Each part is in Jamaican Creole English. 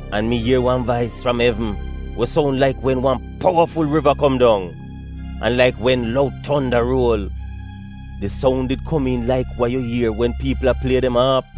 An mi ier wan vais fram evn we soun laik wen wan powaful riva kom dong, an laik wen loud tonda ruol. Di soun did komiin laik wa yu ier wen piipl a plie dem aap.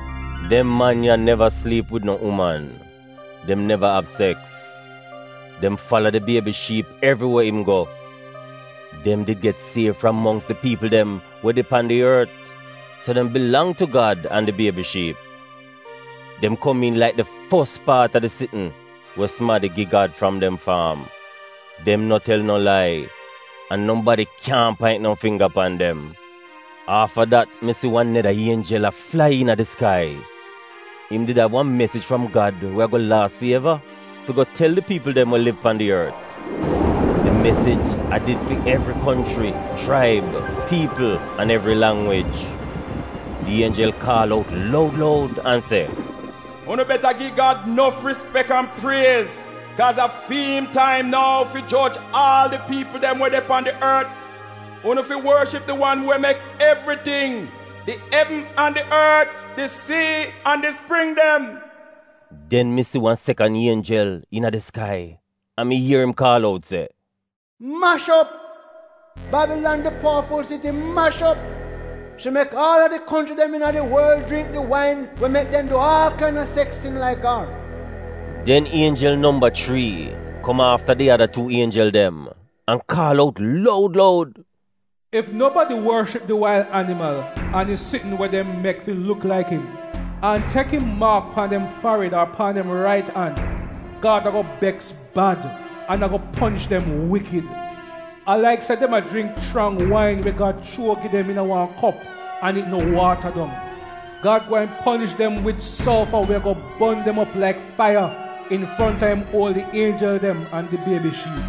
Dem man ya neva sliip wid no uman — dem neva av seks. Dem fala did Biebi Shiip evri we im go. Dem did get siev fram mongks di piipl dem we de pan di ort, so dem bilang tu Gad an di Biebi Shiip. Dem komiin laik di fos paat a di sitn we sumadi gi Gad fram dem faam. Dem no tel no lai, an nobadi kyaahn paint no fingga pan dem. Afta dat, mi si wan neda ienjel a flai iina di skai. Im did av wan mesij fram Gad we ago laas fi eva fi go tel di piipl dem we liv pan di ort. Di mesij a did fi evri konchri, chraib, piipl, an evri langwij. Di ienjel kaal out loud loud an se, “Unu beta gi Gad nof rispek an priez, kaaz a fi'im taim nou fi joj aal a di piipl dem we de pan ort. Unu fi worship di wan we mek evriting: di evn an di ort, di sii an di spring dem.” Den mi si wan sekan ienjel iina di skai an mi ier im kaal out se, “Mash op! Babilan di powaful siti mash op! Shi mek aal a di konchri dem iina di worl jringk di wain we mek dem du aal kaina seks sin laik ar.” Den ienjel nomba chrii kom afta di ada tuu ienjel dem an kaal out loud loud: “Ef enibadi worship di wail animal an di sitn we dem mek fi luk laik im an tek im maak pan dem farid ar pan dem rait an, Gad ago beks bad an ago ponish dem wikid, a laik se dem a jringk chrang wain we Gad chuo gi dem iina wan kop an it no waata dong. Gad gweehn ponish dem wid solfa we ago bon dem op laik faiya infronta im uoli ienjel dem an di Biebi Shiip.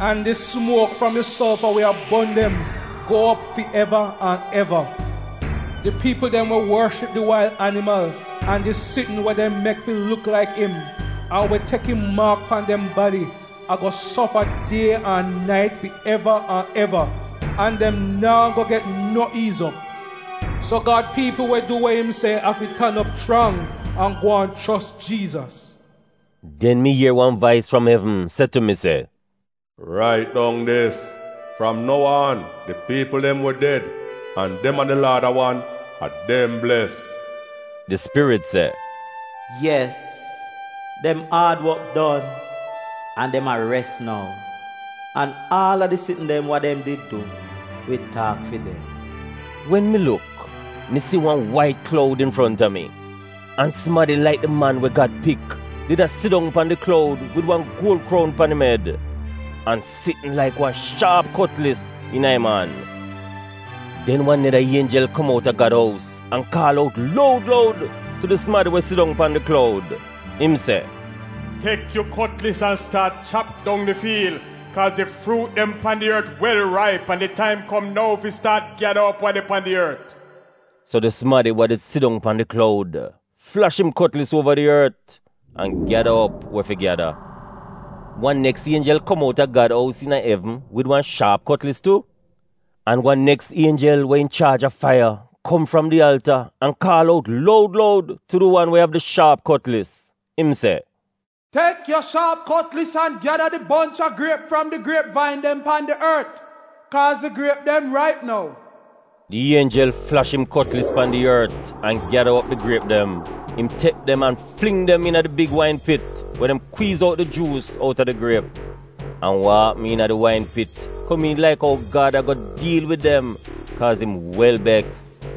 An di sumuok fram di solfa we a bon dem, riez op fi eva an eva. Di piipl dem we worship di wail animal an di sitn we dem mek fi luk laik im, an we tek im maak pan dem badi ago sofa die an nait fi eva an eva an dem naa go get no iiz op.” So Gad piipl we du we im se afi tan op chrang an gwaan chos Jiizas.” Den mi ier wan vais fram evn se tu mi se, “Rait dong dis: fram nou aan, di piipl dem we ded an dem an di Laad a wan, a dem bles.” Di Spirit se, “Yes, dem aad wok don, an dem a res nou, an aal a di sitn dem wa dem did du wi taak fi dem.” Wen mi luk, mi si wan wait kloud infronta mi, an sumadi laik di Man we Gad Pik did a sidong pan di kloud wid wan guol kroun pan im ed, an sitn laik wan shaap kotlis iina im an. Den wan neda ienjel kom outa Gad ous an kaal out luod loud tu di sumadi we sidong pan di kloud, im se, “Tek yu kotlis an staat chap dong di fiil, kaaz di fruut dem pan di ort wel raip an di taim kom nou fi staat gyada op wa de pan di ort.” So di sumadi we did sidong pan di kloud, flash im kotlis uova di ort, an gyada op we fi gyada. Wan neks ienjel kom outa Gad ous iina evn wid wan shaap kotlis tu. An wan neks ienjel we inchaaj a faiya kom fram di alta an kaal out loud loud tu di wan we av di shaap kotlis. Im se, “Tek yu shaap kotlis an gyada di bonch a griep fram di griep vain dem pan di ort, kaaz di griep dem raip nou.” Di ienjel flash im kotlis pan di ort an gyada op di griep dem. Im tek dem, an fling dem iina di big wain pit we dem kwiiz out di juus outa di griep. An wa apm iina di wain pit komiin laik ou Gad ago diil wid dem kaaz im wel beks.